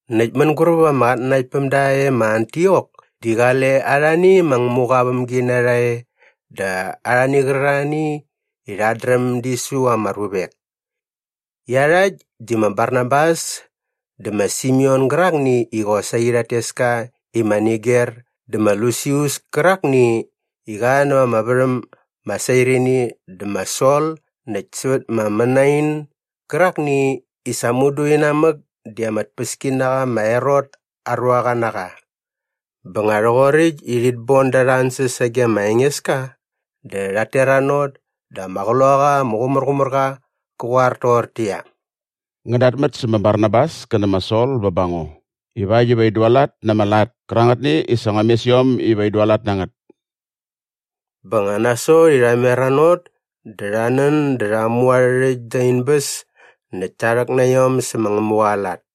Näkt mänguräp ama qatnanaktpämda e ma Antiok di qale arhani ma Ngämuqa aa vämginarha e dä arhani qärarhani i rhat dräm di su ama ruvek. Iarhakt di ma Barnabas dä ma Simeon gärakni i qosaqi rhat tes ka i ma Niger dä ma Lusius kärakni i qa näva ama värhäm ma Sairini dä ma Sol näkt sävät ma Manain gärakni i sa mudu inamäk di ama tpäskinaqa ma Herot aa ruaqa na qa. Bä nga rhoqoräkt i rhit bon da arha ansäs sage ma Engeska dä rhat teranot dä ama Qloqaqa ama Qumärqumärqa qä qoar toqortäqyia, “Ngän datmät sä ma Barnabas kä nä ma Sol bä ba ngo ivakt iva in dualat na ama lat kärangätni i sa ngua mes iom iva in dualat na ngät.” Bä nga nasot i rha meranot dä rha nän dä rha mu arhä rhäkt da in bäs näkt ta rhäk na iom sä ma Ngämuqa aa lat.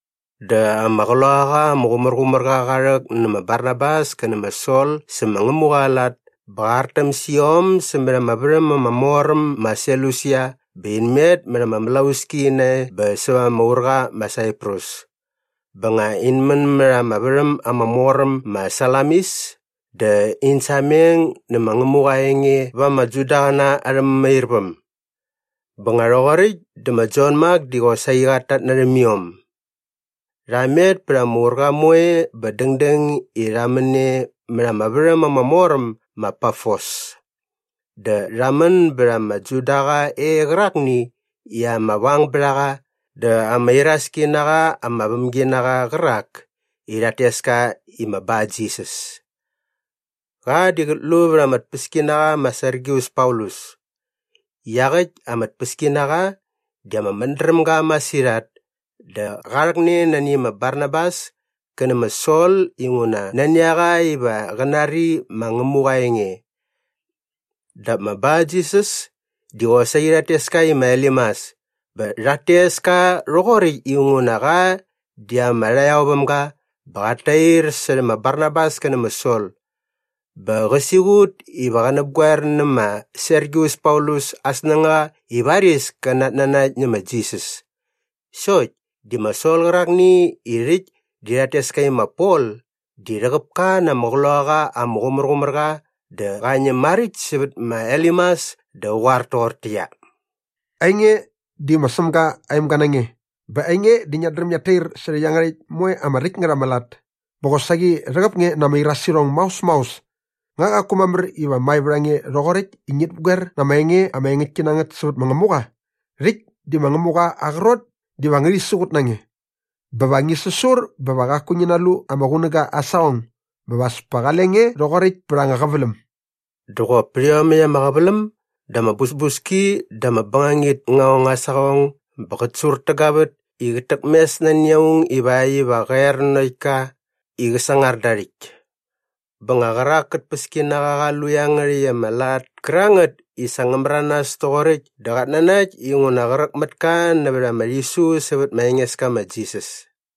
Dä ama Qloqaqa ama Qumärqumärqa qa rhäk nä ma Barnabas kä nä ma Sol sä ma Ngämuqa aa lat bä qa artäm sä iom sämät ama värhäm ama mor äm ma Selusia bä in met mät ama mlauski nae bä säva ama urqa ma Saiprus. Bä nga in män mät ama värhäm ama mor äm ma Salamis dä in sameng nä ma Ngämuqa aa enge va ama Judaqäna arhä mämairväm. Bä nga rhoqoräkt dä ma Jon Mak di qosaqi qat tatnärhäm iom. Rha met pät ama urqa moe bä dängdäng i rha män e mät ama värhäm ama mor äm ma Pafos. Dä rha män bät ama Judaqa e qärakni i ama vangbärhaqa dä ama iraski na qa ama vämginaqa qärak i rhat tes ka i ma Barjisas. Qa di qät lu vät ama tpäskinaqa ma Sergius Paulus. Iaqäkt ama tpäskinaqa di ama mädrämga masirhat dä qa rhäkne nani ma Barnabas kä nä ma Sol inguna nani a qa iva qä nari ma Ngämuqa aa enge. Dap ma Barjisas di qosaqi rhat tes ka i ma Elimas bä rhat tes ka rhoqoräkt inguna qa di ama rhaqyaovämga bä qat tair särhä ma Barnabas kä nä ma Sol. Bä qä siqut iva qä näpgoer nä ma Sergius Paulus aa snängaqa i varis kä natnanakt nä ma Jisas. Sokt di ma Sol qärakni i rhäkt di rhat tes ka i ma Pol di rhäqäp ka na ama Qloqaqa ama Qumärqumärqa dä qa ñäm maräkt sävät ma Elimas dä qä qoar toqortäqyia, “Ainge di ma Sämga aa emga na nge bä ainge di ngiat dräm ngiat tair särhä iangärhäkt moe ama räkt ngät ama lat. Bä qosaqi rhäqäp nge na ama irasirhong maos maos. Nga qaku mamär iva mae vät a nge rhoqoräkt i ngit näpgoer na ama enge ama engäktki na ngät sävät ma Ngämuqa? Rhäkt di ma Ngämuqa aa qrot diva ngärhi siqut na nge. Bä va ngi säsur bä va qaku ngi nalu ama qunäga aa saqong bä va as kale nge rhoqoräkt pät anga qäväläm.” Dä qop pät iomäkt ama qäväläm dä ama busbuski dä ama bängangit ngä ong aa saqong bä qät surtägavät i qät täk mes nani aung ivakt iva qä er nanokt ka i qä sangar da aa rhäkt. Bä nga qärak kä tpäskinaqa qa lu iangärhäkt ama lat kärangät i sa ngä märanas toqoräkt dä qat nanakt inguna qräk mät ka nävät ama rhisu sävät ma Engeska ma Jisas.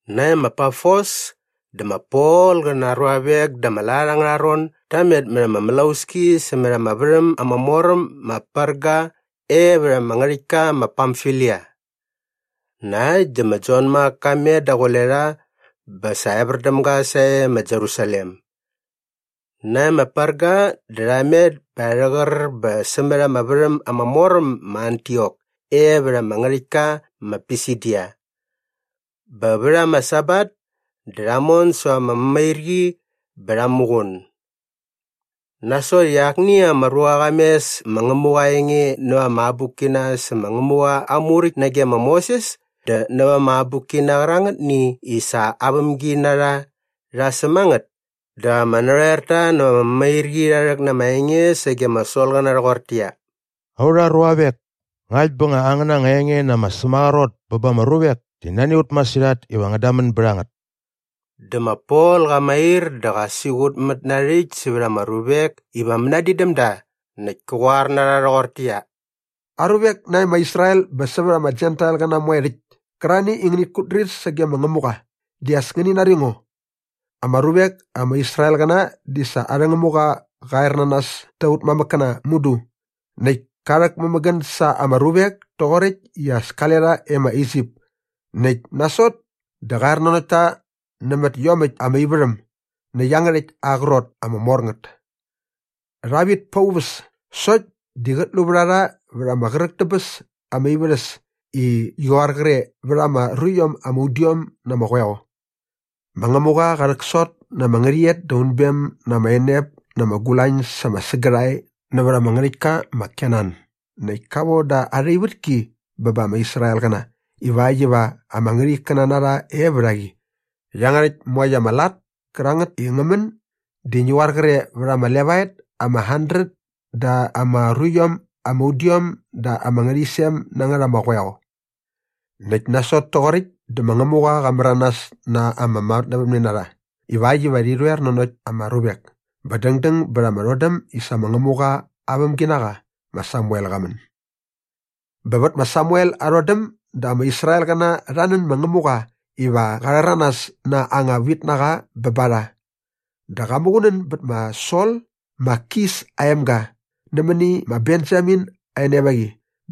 Nae ma Pafos dä ma Pol qä na aa ruavek da ama lat angärha ron da met mät ama mlauski sämät ama värhäm ama mor äm ma Perga e vät ama ngärhäktka ma Pamfilia. Na äkt dä ma Jon Mak ka met daqule rha bä sa evär däm ga sae ma Jerusalem. Nae ma Perga dä rha met bä rha rhäqär bä sämät ama värhäm ama mor äm ma Antiok e vät ama ngärhäktka ma Pisidia. Bä vät ama Sabat dä rha mon säva ama mämairqi bä rha muqun. Nasot i akni ama ruqa qa mes ma Ngämuqa aa enge näva ama abukkina sä ma Ngämuqa aa Muräkt nage ma Moses dä näva ama abukkina qärangätni i sa aa vämginarha rha säm a ngät dä ama narhoerta näva ama mämairqi rha rhäk na ama enge sage ma Solqäna rhoqortäqyia, “Aurha ruavek, ngakt bä angäna anga enge na ama sämaqrot bä ba ama ruvek di nani a ut masirhat iva ngän damän bät a ngät.” Dä ma Pol qa mair dä qa siqutmät na aa rhäkt sävät ama ruvek iva mänadin däm da näkt kä qoar na rha rhoqortäqyia, “Aruvek nae ma Israel bä sävät ama Jentailqäna moe rhäkt kärarhani i ngänit kutdrir sage ma Ngämuqa, di as ngäni nari ngo! Ama ruvek ama Israelqäna di sa arhä Ngämuqa qa ernanas ta aut mamäkkäna mudu näkt ka rhäkmämägän sa ama ruvek toqoräkt i qale rha e ma Isip näkt nasot dä qa er nanokt ta nämät iomäkt ama ivärhäm nä iangärhäkt aa qrot ama mor ngät. Rha vit pa aa uväs sokt di qät lu vät a rha vät ama qräk dä bäs ama ivärhäs i ngi qoar qre vät ama ruiom ama udiom na ama qoeo. Ma Ngämuqa qa rhäksot na ama ngärhäqyet da unbem na ama enep na ama gulañ sa ama sägärhae nävät ama ngärhäktka ma Kenan näkt ka von da arha ivätki bä ba ama Israelqäna ivakt iva ama ngärhikkäna na rha e vät a qi. Iangärhäkt moekt ama lat kärangät i ngä män di ngi qoar qre vät ama levaet ama handret da ama ruiom ama udiom da ama ngärhäqyisem na ngät ama qoeo. “Näkt nasot toqoräkt dä ma Ngämuqa qa märanas na ama matnävämnenarha ivakt iva rhi rhoer nanokt ama ruvek bä dängdäng bät ama rhodäm i sa ma Ngämuqa aa vämginaqa ma Samuel qa män. Bä vät ma Samuel aa rhodäm dä ama Israelqäna rha nän ma Ngämuqa iva qa rhäranas na anga vitnaqa bä ba rha dä qa muqunän bät ma Sol ma Kis aa emga nämäni ma Benjamin aa enevaqi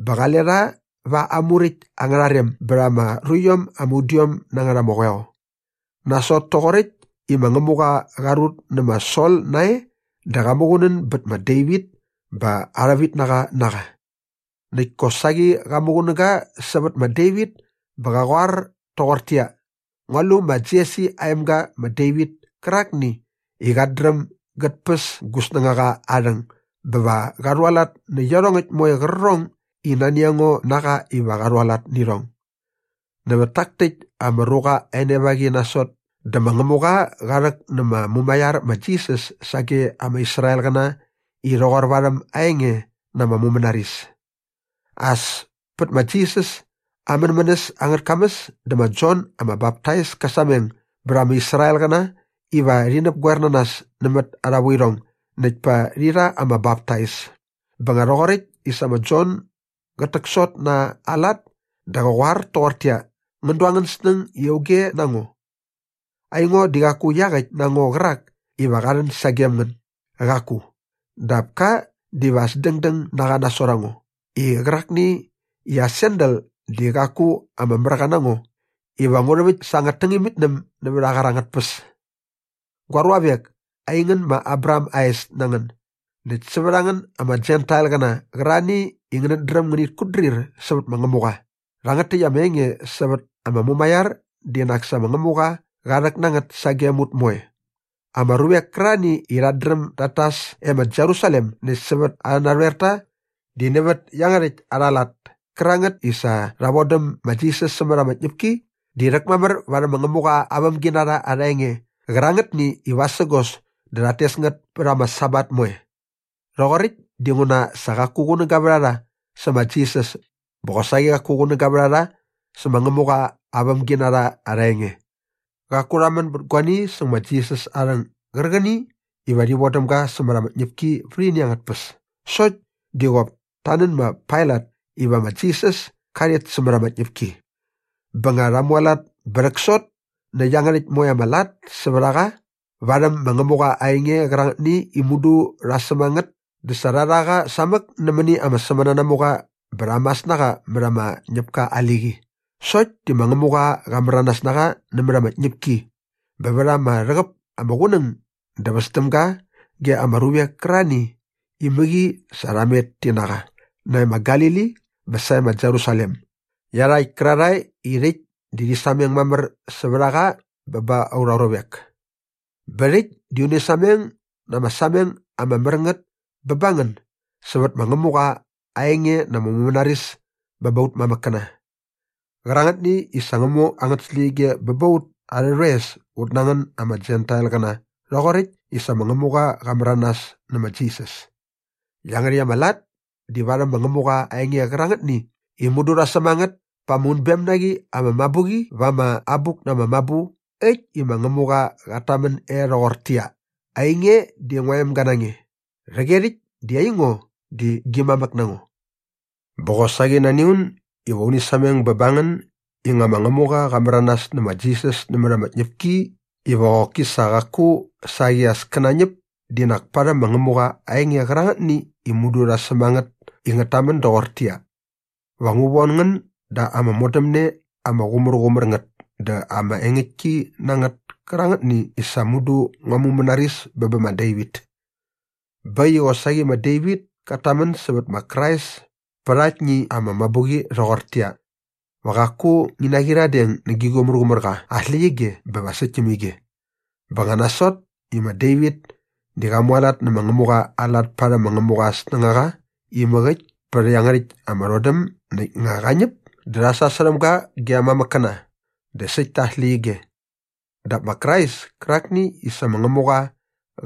bä qale rha va aa muräkt angärha rem bät ama ruiom ama udiom na ngät ama qoeo. Nasot toqoräkt i ma Ngämuqa qa rut nä ma Sol nae dä qa muqunän bät ma Devit bä arha vitnaqa na qa. Näkt kosaqi qa muqunäga sävät ma Devit bä qa qoar toqortäqyia, ‘Ngua lu ma Jesi aa emga ma Devit kärakni i qat dräm gät päs gu snängaqa aa rhäng bä va qa rhualat nä iarhongäkt moe qärqärhong i nani a ngo na qa iva qa rhualat nä irhong.’ “Nävät tak täkt ama ruqa aa enevaqi nasot dä ma Ngämuqa qa rhäk nä ma Mumaiar ma Jisas sage ama Israelqäna i rhoqor varhäm aa enge na ama mumänaris. As pät ma Jisas aa mänmänäs angät kamäs dä ma Jon ama Baptais kä sameng bät ama Israelqäna iva rhi näpgoer na nas nämät arha vuirhong näkt pa rhi rha ama baptais. Bä nga rhoqoräkt i sa ma Jon gät täksot na aa lat dä qä qoar toqortäqyia, ‘Ngän du angän snäng i auge na ngo? Aingo di qaku iaqäkt na ngo qärak iva qa rhän sagem ngän. Qaku. Dap ka diva as dängdäng na qa nasot a ngo i qärakni i aa sandal di qaku ama märqa na ngo iva ngu rhäväkt sa angät tängämitnäm nävät aa qar angät tpäs.’ “Gua ruavek, aingän ma Abraham aa es na ngän näkt sävät a ngän ama Jentailqäna qärarhani i ngänät dräm ngänit kutdrir sävät ma Ngämuqa, rhangät täkt ama enge sävät ama mumaiar di nak sa ma Ngämuqa qa rhäk na ngät sagem ut moe. Ama ruvek kärarhani i rhat dräm dat tas e ma Jerusalem näkt sävät arhä narhoerta di nävät iangärhäkt arha lat kärangät i sa rha vodäm ma Jisas sämät ama tñäpki di rhäkmamär varhäm ma Ngämuqa aa vämginarha arha enge qärangätni i vasägos dä rhat tes ngät pät ama Sabat moe. Rhoqoräkt dinguna sa qaku qunäga vät a rha sä ma Jisas bä qosaqi qaku qunäga vät a rha sä ma Ngämuqa aa vämginarha arha enge. “Qaku rha män bät guani säng ma Jisas aa rhäng gärqäni iva rhi vodäm ga sämät ama tñäpki vät ini angät tpäs sokt di qop ta nän ma Pailat iva ma Jisas ka rhet sämät ama tñäpki. Bä nga rha mualat bä rhäksot nä iangärhäkt moe ama lat sävät a qa värhäm ma Ngämuqa aa enge qärangätni i mudu rha säm a ngät dä sa rha rha qa samäk nämäni ama sämänanamuqa bä rha mas na qa mät ama ñäpka aa liqi. Sokt di ma Ngämuqa qa märanas na qa nämät ama tñäpki bä vät ama rhäqäp ama qunäng dä väs däm ga ge ama ruvek kärarhani i mäqi sa rha met ti na qa nae ma Galili bä sae ma Jerusalem iarhakt kärarhae i rhäkt di rhi sameng mamär sävät a qa bä ba aurha ruvek. “Bä rhakt di uni sameng na ama sameng ama mär ngät bä ba ngän sävät ma Ngämuqa aa enge na ama mumänaris bä ba aut mamäkkäna qärangätni i sa ngä mu angät släqyige bä ba ut arhä rhoes ut na ngän ama Jentailqäna rhoqoräkt i sa ma Ngämuqa qa märanas nä ma Jisas. Iangärhäkt ama lat di varhäm ma Ngämuqa aa enge qärangätni i mudu rha säm a ngät pa ama unbem na qi ama mabuqi va ama Abuk na ama Mabu äkt i ma Ngämuqa qat tamän e rhoqortäqyia, “‘Ainge di ngua emga na nge. Rhäqyerhäkt di aingo di gi mamäk na ngo.’ Bä qosaqi nani a un iva uni sameng bä ba ngän i nga ma Ngämuqa qa märanas nä ma Jisas nämät ama tñäpki iva qoki sa qaku saqi as kä nañäp di nak parhäm ma Ngämuqa aa enge qärangätni i mudu rha säm a ngät i ngät tamän doqortäqyia, “‘Va ngu von ngän da ama modämne ama qumärqumär ngät dä ama engäktki na ngät kärangätni i sa mudu ngua mumänaris bä bä ma Devit.’ Bä äkt i qosaqi ma Devit kat tamän sävät ma Krais pät aktni ama mabuqi rhoqortäqyia, “‘Va qaku ngi naqyiradeng nä gi Qumärqumärqa aa släqyige bä va säkt täm ige.’ Bä nga nasot i ma Devit di qa mualat nä ma Ngämuqa aa lat parhäm ma Ngämuqa aa snängaqa imäk äkt pät iangärhäkt ama rhodäm näkt nga qa ñäp dä rha sasärhäm ga ge aa mamäkkäna dä säkt ta aa släqyige. Dap ma Krais kärakni i sa ma Ngämuqa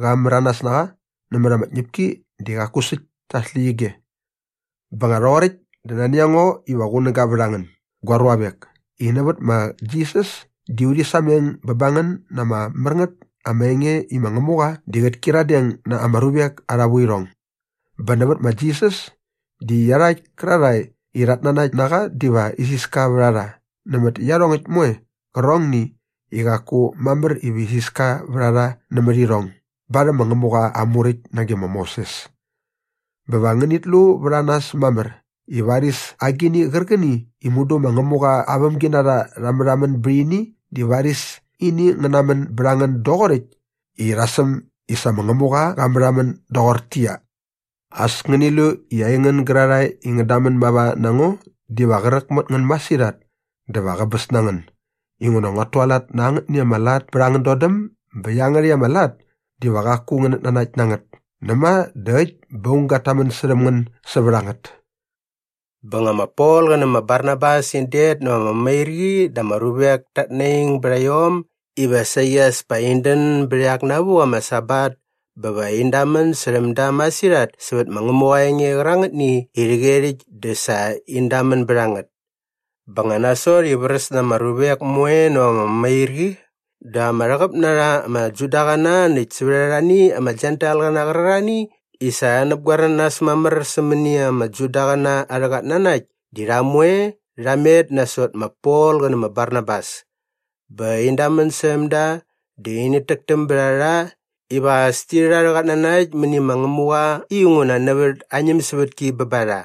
qa märanas na qa nämät ama tñäpki di qaku säkt ta aa släqyige. “Bä nga rhoqoräkt dä nani a ngo iva qunäga vät a ngän, gua ruavek, i nävät ma Jisas di urhi sameng bä ba ngän na ama mär ngät ama enge i ma Ngämuqa di qät kyiradeng na ama ruvek arha vuirhong. Bä nävät ma Jisas di iarhakt kärarhae i rhat nanakt na qa diva isiska vät a rha nämät iarhongäkt moe qärqärhong i qaku mamär iva isiska vät a rha nämät irhong barhäm ma Ngämuqa aa Muräkt nage ma Moses. Bä va ngänit lu vät a nas mamär i varis agini qärqäni i mudu ma Ngämuqa aa vämginarha rha märhamän bät ini di varis ini ngä namän bät a ngän doqoräkt i rha säm i sa ma Ngämuqa qa märhamän doqortäqyia, “‘As ngäni lu i aingän gärarhae i ngän damän mava na ngo diva qräk mät ngän masirhat dä va qäbäs na ngän inguna nguat tualat na angätni ama lat pät angän dodäm bä iangärhäkt ama lat diva qaku ngänät nanakt na ngät näma dä äkt bä aung gat tamän särhäm ngän sävät a ngät.’” Bä nga ma Pol qä nä ma Barnabas in det näva ama mämairqi dä ama ruvek ta naing bät iom iva saqi as pa in dän bät iak navuk ama Sabat bä va in damän särhäm da masirhat sävät ma Ngämuqa aa enge qärangätni i rhäqyerhäkt dä sa in damän bät a ngät. Bä nga nasot i vräs na ama ruvek moe näva ama mämairqi dä ama rhäqäp na rha ama Judaqäna näkt sävät arhani ama Jentailqäna qärarhani i sa rha näpgoer na nas mamär sämäni ama Judaqäna arhä qatnanakt di rha moe rha met nasot ma Pol qä nä ma Barnabas. Bä in damän särhäm da dä init täktäm bät a rha iva as ti rhät arhä qatnanakt mäni ma Ngämuqa inguna nävät aa ñämsävätki bä ba rha.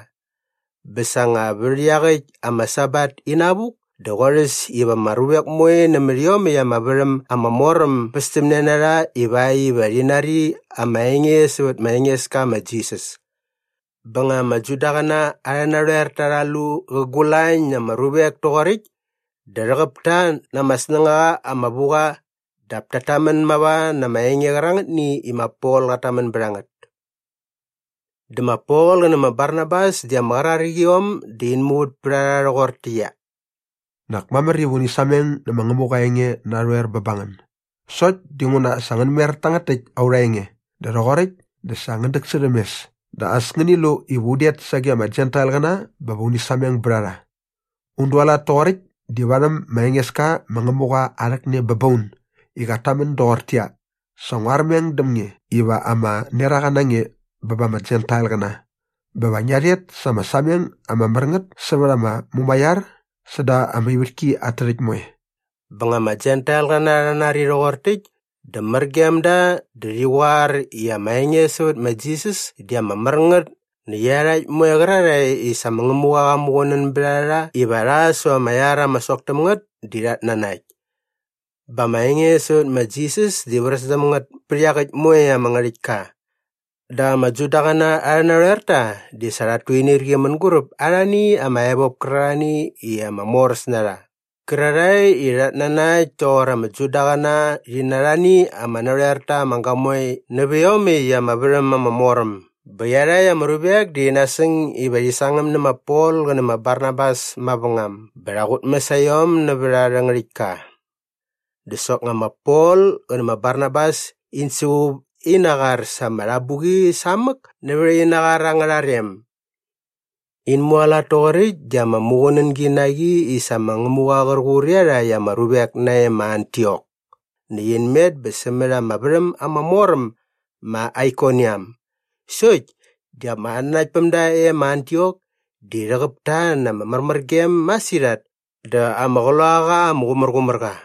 Bä sa nga vät iaqäkt ama Sabat inavuk dä qorhäs iva ama ruvek moe nämät iomäkt ama värhäm ama mor äm bästämne na rha ivakt iva rhi nari ama enge sävät ma Engeska ma Jisas. Bä nga ama Judaqäna arhä narhoerta rha lu qä gulañ na ama ruvek toqoräkt dä rhäqäp ta na ama snängaqa ama vu qa dap tat tamän mava na ama enge qärangätni i ma Pol qat tamän bät a ngät. Dä ma Pol qä nä ma Barnabas di ama qraräk iom dä in muvät pät a rha rhoqortäqyia, “Nak mamär iva uni sameng nä ma Ngämuqa aa enge narhoer bä ba ngän. Sokt dinguna sa ngän mer tangät täkt aurha enge dä rhoqoräkt dä sa ngän däksärhäm mes dä as ngäni lu iva un det sage ama Jentailqäna bä va uni sameng bät a rha. Un dualat toqoräkt di varhäm ma Engeska ma Ngämuqa aa rhäkne bä ba un i qat tamän doqortäqyia, “‘Sa ngua armeng däm nge iva ama neraqa na nge bä ba ama Jentailqäna bä va ngia rhet sa ama sameng ama mär ngät sävät ama mumaiar säda ama ivätki at tärhäkt moe.’” Bä nga ama Jentailqäna rha nari rhoqor täkt dä mär gem da dä rhi qoar i ama enge sävät ma Jisas di ama mär ngät näkt iarhakt moe qärarhae i sa ma Ngämuqa qa muqunän bät a rha iva rha säva ama iar ama sok täm ngät di rhat nanakt. Bä ama enge sävät ma Jisas di vräs däm ngät pät iaqäkt moe ama ngärhäktka. Dap ama Judaqäna arhä narhoerta di sa rhat tuinirqi mänguräp arhani ama evop kärarhani i ama moräs na rha qärarhae i rhat nanakt toqor ama Judaqäna rhi na arhani ama narhoerta ama gamoe nävä iomäkt ama värhäm ama mor äm bä iarhakt ama ruvek di rhi nasäng iva rhi sangäm nä ma Pol qä nä ma Barnabas mavängam bä rha qutmäs a iom nävät arhä ngärhäktka. Dä soknga ma Pol qä nä ma Barnabas in suqup ina qar sa ama rhabuqi samäk nävät ina qar angärha rem. In mualat toqoräkt di ama muqunängi na qi i sa ma Ngämuqa qär qur iarhakt ama ruvek nae ma Antiok näkt in met bä sämät ama värhäm ama mor äm ma Aikoniam. Sokt di ama qatnanaktpämda e ma Antiok di rhäqäp ta na ama märmärgem masirhat dä ama Qloqaqa ama Qumärqumärqa.